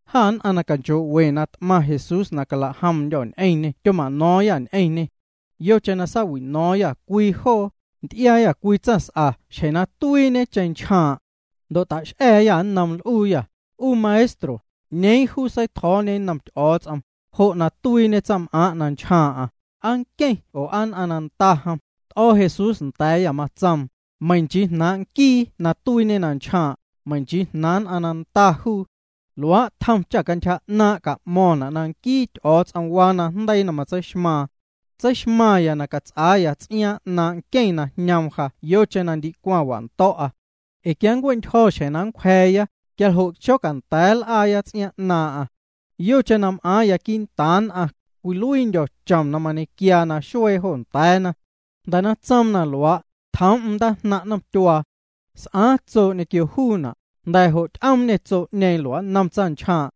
Jâ nn'aⁿ na canchoo'we na t'maⁿ Jesús na calajomndyô̱ ñ'eⁿñê tyoma'no̱o̱ⁿyâ ñ'eⁿñê. Yocheⁿ na saawi'no̱o̱ⁿyâ cwii joo, nty'iaayâ cwii tsaⁿs'a xjeⁿ na tuiiñe na nchjaaⁿ'. Ndo' tax'a̱a̱yâ nnoom, l'uuyâ: —'U Maestro, ¿'ñeeⁿ juu seitjo̱o̱ñe nnom Ty'o̱o̱ts'om, jo' na tuiiñe tsaⁿm'aaⁿ' na nchjaaⁿ'aⁿ? ¿Aa nqueⁿ oo aa nn'aⁿ na nda jom? T'o̱ Jesús nda̱a̱yâ, matsoom: —Meiⁿ nchii jnaaⁿ' nquii na tuiiñe na nchjaaⁿ', meiⁿ nchii jnaaⁿ nn'aⁿ na nda juu. Luaa' tjom cha cantyja 'naaⁿ' ca'mo̱ⁿna' na nquii Ty'o̱o̱ts'om waa najndeii na matseixmaaⁿ. Tseixmaⁿya na cats'aaya ts'iaaⁿ 'naaⁿ' nqueⁿ na jñoom ja yocheⁿ na ndicwaⁿ wando̱'a. Ee quia nncue'ntyjo̱ xjeⁿ na nncwja̱a̱ya, quia jo' xonda̱a̱ nl'aatya̱a̱ya ts'iaaⁿ 'naaⁿ'aⁿ. Yocheⁿ na m'aaⁿya quii'ntaaⁿ nn'aⁿ, cwiluiindyo̱ chom na mañequiaa naxuee jo nda̱a̱na. Jnda̱ na tsoom na luaa', tjoom'm ndaajnaⁿ' nomtyuaa. S'aaⁿ tsoo' ñequio juuna', jnda̱ jo' ty'oomñê tsoo'ñeeⁿ lua'nnom tsaⁿnchjaaⁿ'.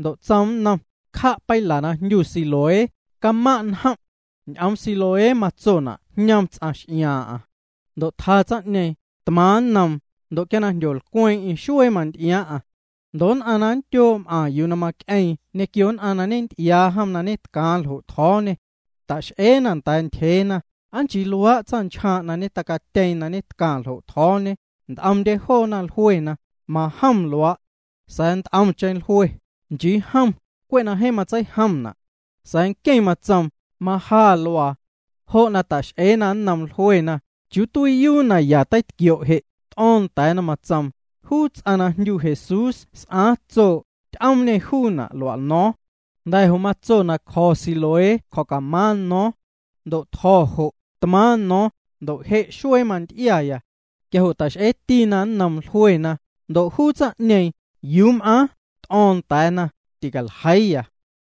Ndo' tsoom nnom: —Cja' peila na jndyu Siloé, camaⁿ' n'omnjom'. Ñ'oom Siloé matsona' jñom ts'aⁿ x'iaaⁿ'aⁿ. Ndo' tja tsaⁿ'ñeeⁿ, tmaaⁿ nnoom. Ndo' quia jndyolcweeⁿ'eⁿ xuee manty'iaaⁿ'aⁿ. Ndo' nn'aⁿ na nndyoo' m'aⁿ yuu na mac'eeⁿ ñequio nn'aⁿ na ñenty'iaana jom na ñetcaaⁿ ljo' tjo̱o̱ñê, ta'x'eena nda̱a̱ ntyjeena: —¿Aa nchii luaa' tsaⁿnchjaaⁿ' na tacatyeeⁿ na tcaⁿ ljo' tjo̱o̱ñe? Nt'omndye joona jluena: —Majom luaa'. Sa̱a̱ nt'omcheⁿ jlue: —Nchii jom, cwe' na jeeⁿ tseijomna'. Sa̱a̱ nqueⁿ matsoom: —Maja luaa. Jo' na ta'x'eena nnoom, jluena: —¿Chiuu tuiiyuu na ya teitquio' je'? T'o̱o̱ⁿ nda̱a̱na, tsoom: —Juu ts'aⁿ na jndyu Jesús s'aaⁿ tsoo', ty'oomñê juuna' lua'no̱o̱ⁿ. Jnda̱ jo' matso na cjo̱ya Siloé na cjo̱camaaⁿ no̱o̱ⁿ. Ndo' tjo̱ jo', tmaaⁿ no̱o̱ⁿ, ndo' je' xuee manty'iaya. Quia jo' ta'x'eetina nnoom, jluena: —¿Ndo' juu tsaⁿ'ñeeⁿ, yuu m'aaⁿ? T'o̱o̱ⁿ nda̱a̱na: —Ticaljeiiya.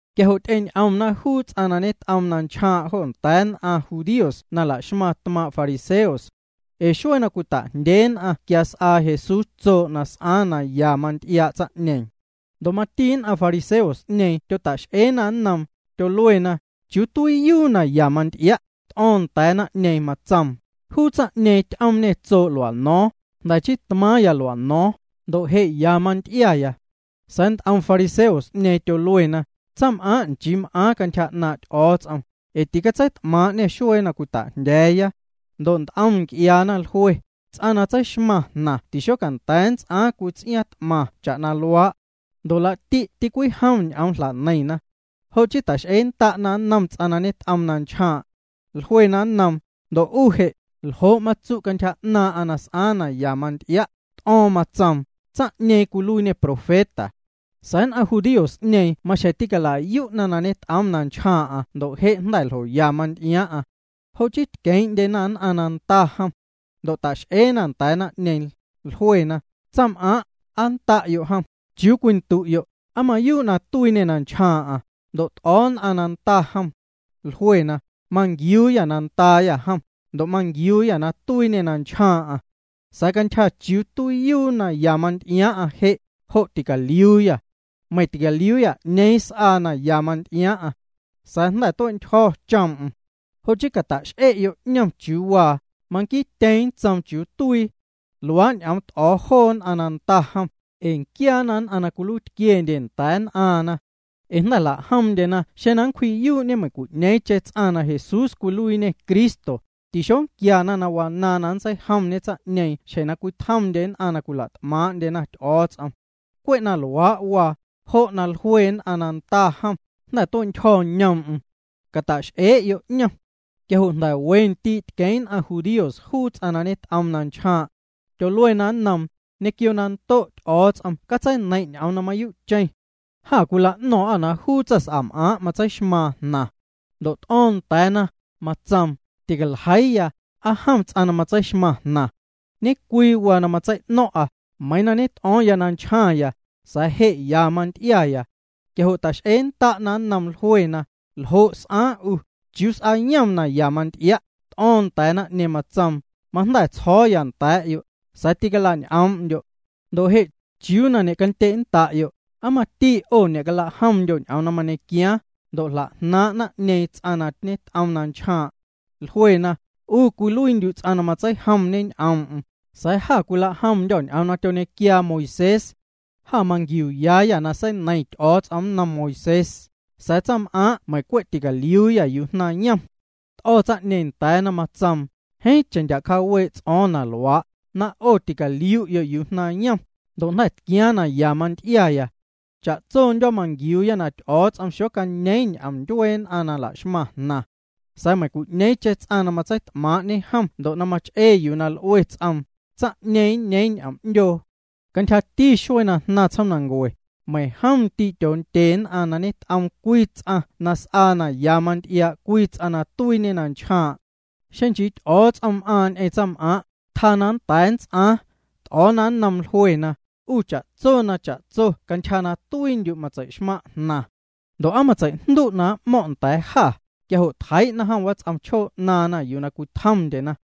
Quia jo' ty'eñ'omna juu ts'aⁿ na ñet'oom na nchjaaⁿ' jo nda̱a̱ nn'aⁿ judíos na la'xmaⁿ tmaaⁿ' fariseos. Ee xuee na cwita'jndyee nn'aⁿ quia s'aa Jesús tsoo' na s'aaⁿ na ya manty'iaa' tsaⁿ'ñeeⁿ. Ndo' mati nn'aⁿ fariseos'ñeeⁿ tyota'x'eena nnoom. Tyoluena: —¿Chiuu tuiiyuu na ya manty'ia'? T'o̱o̱ⁿ nda̱a̱ naⁿ'ñeeⁿ, tsoom: —Juu tsaⁿ'ñeeⁿ ty'oomñê tsoo' lua'no̱o̱ⁿ, jnda̱ chii tmaaⁿya lua'no̱o̱ⁿ, ndo' je' ya manty'iaya. Sa̱a̱ nt'om fariseos'ñeeⁿ tyoluena: —Tsaⁿs'am'aaⁿ' nchii m'aaⁿ cantyja 'naaⁿ' Ty'o̱o̱ts'om, ee ticatseit'maaⁿ'ñê xuee na cwita'jndya̱a̱ya. Ndo' nt'om nc'iaana jlue: —Ts'aⁿ na tseixmaⁿ jnaⁿ tixocanda̱a̱ nnts'aaⁿ cwii ts'iaaⁿ t'maⁿ cha'na luaa'. Ndo' laa'ti' tîcwijom ñ'oom na jla'neiⁿna. Jo' chii ta'x'eennda'na nnom ts'aⁿ na ñet'oom na nchjaaⁿ'. Jluena nnoom: —Ndo' 'u je', ¿ljo' matsu' cantyja 'naaⁿ'aⁿ na s'aaⁿ na ya manty'ia'? T'o̱o̱ⁿ, matsoom: —Tsaⁿ'ñeeⁿ cwiluiiñê profeta. Sa̱a̱ nn'aⁿ judíos'ñeeⁿ maxjeⁿ tiñe'cala'yu'na na ñet'oom na nchjaaⁿ'aⁿ ndo' je' jnda̱ ljoya manty'iaaⁿ'aⁿ. Jo' chii tqueeⁿ'ndyena nn'aⁿ na nda jom. Ndo' ta'x'eena nda̱a̱ naⁿ'ñeeⁿ, jluena: —Tsaⁿm'aaⁿ', ¿aa nda'yo' jom? Chiuu cwindu'yo', ¿aa mayuu' na tuiiñê na nchjaaⁿ'aⁿ? Ndo' t'o̱o̱ nn'aⁿ na nda jom. Jluena: —Manquiuuyâ na ndaayâ jom, ndo' manquiuuyâ na tuiiñê na nchjaaⁿ'aⁿ. Sa̱a̱ cantyja chiuu tuiiyuu na ya manty'iaaⁿ'aⁿ je', jo' ticaliuuyâ. Meiⁿ ticaliuuyâ 'ñeeⁿ s'aa na ya manty'iaaⁿ'aⁿ. Sa̱a̱ jnda̱ tue'ntyjo̱ choom'm. Jo' chii cata'x'ee'yo' 'ñom chiuu waa. Manquiityeeⁿ nntsoom chiuu tuii. Luaa' ñ'oom t'o̱o̱ joo nn'aⁿ na nda jom, ee nquiaana nn'aⁿ na cwiluiitquiendye nda̱a̱ nn'aaⁿna. Ee jnda̱ jla'jomndyena xeⁿ na nncwji'yuu'ñe meiⁿcwi'ñeeⁿcheⁿ ts'aⁿ na Jesús cwiluiiñê Cristo, tixonquiana na wanaaⁿ na nntseijomñe tsaⁿ'ñeeⁿ xjeⁿ na cwitjomndye nn'aⁿ na nla't'maaⁿ'ndyena Ty'o̱o̱ts'om. Cwe' na luaa' waa, jo' na jlue nn'aⁿ na nda jom: “Jnda̱ tue'ntyjo̱ ñoom'm. Cata'x'ee'yo' 'ñom.” Quia jo' jnda̱ we ndii' tqueeⁿ' nn'aⁿ judíos juu tsaⁿ na ñet'oom na nchjaaⁿ'. Tyoluena nnoom: —Ñequio na ndo' Ty'o̱o̱ts'om catseineiⁿ' ñ'oom na mayuu'cheⁿ. Jâ cwila'no̱o̱ⁿ'â na juu tsaⁿs'am'aaⁿ' matseixmaaⁿ jnaⁿ. Ndo' t'o̱o̱ⁿ nda̱a̱na, matsoom: —Ticaljeiiya, aa jom ts'aⁿ na matseixmaⁿ jnaⁿ. Ñe'cwii waa na matsei'no̱ⁿ'a, meiiⁿ na ñet'o̱o̱ⁿ na nchjaⁿya, sa̱a̱ je' ya manty'iaya. Quia jo' ta'x'eennda'na nnoom. Jluena: —¿Ljo' s'aaⁿ 'u? ¿Chiuu s'aayom na ya manty'ia'? T'o̱o̱ⁿ nda̱a̱ naⁿ'ñeeⁿ, matsoom: —Majnda̱ tsjo̱o̱ya nda̱a̱'yo', sa̱a̱ ticalañ'oom'ndyo'. Ndo' je' ¿chiuu na ñe'candye'nnda'yo'? ¿Aa mati 'o ñe'calajomndyo' ñ'oom na mañequiaaⁿ? Ndo' jla'jnaaⁿ' naⁿ'ñeeⁿ ts'aⁿ na ñet'oom na nchjaaⁿ'. Jluena: —'U cwiluiindyu' ts'aⁿ na matseijomñe ñ'oom'm, sa̱a̱ jâ cwilajomndyô̱ ñ'oom na tyoñequiaa Moisés. Jâ manquiuuyayâ na seineiⁿ Ty'o̱o̱ts'om nnom Moisés, sa̱a̱ tsaⁿm'aaⁿ' meiⁿ cwe' ticaliuuyâ yuu jnaⁿyom. T'o̱ tsaⁿ'ñeeⁿ nda̱a̱na, matsoom: —Jeeⁿcheⁿ ndya' cjaawee' ts'o̱o̱ⁿ na luaa', na 'o ticaliu'yo' yuu jnaⁿyom, ndo' jnda̱ tquiaaⁿ na ya manty'iaya. Cha'tsondyo̱ manquiuuya na Ty'o̱o̱ts'om xocañeeⁿ ñ'oom ndyuee nn'aⁿ na laxmaⁿ jnaⁿ. Sa̱a̱ meiⁿcwi'ñeeⁿcheⁿ ts'aⁿ na matseit'maaⁿ'ñe jom ndo' na mach'ee yuu na l'ue ts'oom, tsaⁿ'ñeeⁿ nñeeⁿ ñ'oom 'ndyoo. Cantyjati xuee na jnaⁿ tsjoomnancue, meiⁿjom ndii' tyoondye nn'aⁿ na ñet'oom cwii ts'aⁿ na s'aa na ya manty'iaa' cwii ts'aⁿ na tuiiñe na nchjaaⁿ'. Xeⁿ nchii Ty'o̱o̱ts'om m'aaⁿ ñ'eⁿ tsaⁿm'aaⁿ', tjaa na nnda̱a̱ nnts'aaⁿ. T'o̱o̱na nnoom, jluena: —'U cha'tso na cha'tso cantyja na tuiindyu' matsei'xmaⁿ' jnaⁿ. Ndo' ¿aa matseijndu' na m'mo̱ⁿ' nda̱a̱ jâ? Quia jo' tjeii'na jom wats'om chjoo 'naaⁿna yuu cwitjomndyena.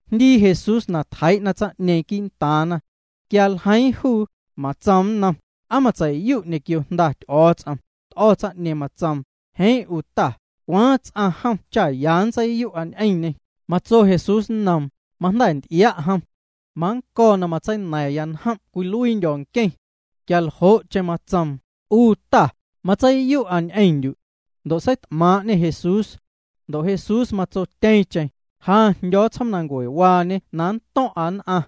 Jndii Jesús na tjeii'na tsaⁿ'ñeeⁿ quii'ntaaⁿna. Quia ljeiiⁿ juu, matsoom nnom: —¿Aa matseiyu' ñequio Jnda Ty'o̱o̱ts'om? T'o̱ tsaⁿ'ñeeⁿ, matsoom: —Jeeⁿ 'u Ta, ¿cwaaⁿ ts'aⁿ jom cha ya nntseiyu'a ñ'eⁿñê? Matso Jesús nnoom: —Majnda̱ nty'ia' jom. Mannco̱ na matseina̱ⁿya njom' cwiluiindyo̱ nqueⁿ. Quia jo'cheⁿ matsoom: —'U Ta, matseiyu'a ñ'eⁿndyu'. Ndo' seit'maaⁿ'ñê Jesús. Ndo' Jesús matsotyeeⁿcheⁿ: —Ja jndyo̱o̱ tsjoomnancuewaañe na nnto̱ⁿ'a nn'aⁿ.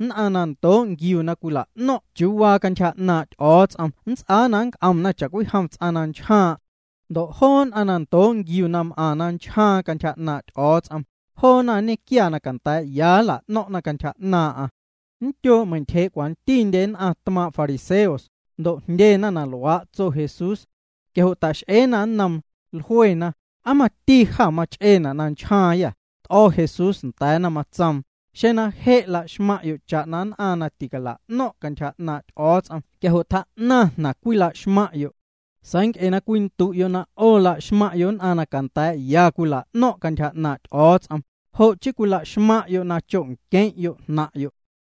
Nquiee nn'aⁿ na ndoo' nquiuna na cwila'no̱ⁿ'na chiuu waa cantyja 'naaⁿ' Ty'o̱o̱ts'om nnts'aa na nnc'omna cha'cwijom ts'aⁿ na nchjaaⁿ'. Ndo' joo nn'aⁿ na ndoo' nquiuna na m'aⁿna na nchjaaⁿna cantyja 'naaⁿ' Ty'o̱o̱ts'om, joona nñequiaya na canda̱a̱'ya nla'no̱ⁿ'na cantyja 'naaⁿ'aⁿ. Nndyoo' meintyjee' cwantindye nn'aⁿ tmaaⁿ' fariseos, ndo' jndyena na luaa' tso Jesús. Quia jo' ta'x'eena nnoom, jluena: —¿Aa mati jâ mach'eena' na nchjaaⁿyâ? T'o̱ Jesús nda̱a̱na, matsoom: —Xeⁿ na je' laxmaⁿ'yo' cha'na nn'aⁿ na ticala'no̱ⁿ' cantyja 'naaⁿ' Ty'o̱o̱ts'om quia jo' tjaa'naⁿ jnaⁿ na cwilaxmaⁿ'yo'. Sa̱a̱ nc'e na cwindu'yo' na 'o laxmaⁿ'yo' nn'aⁿ na canda̱a̱'ya cwila'no̱ⁿ' cantyja 'naaⁿ' Ty'o̱o̱ts'om, jo' chii cwilaxmaⁿ'yo' na cho'nqueⁿ'yo' jnaⁿ'yo'.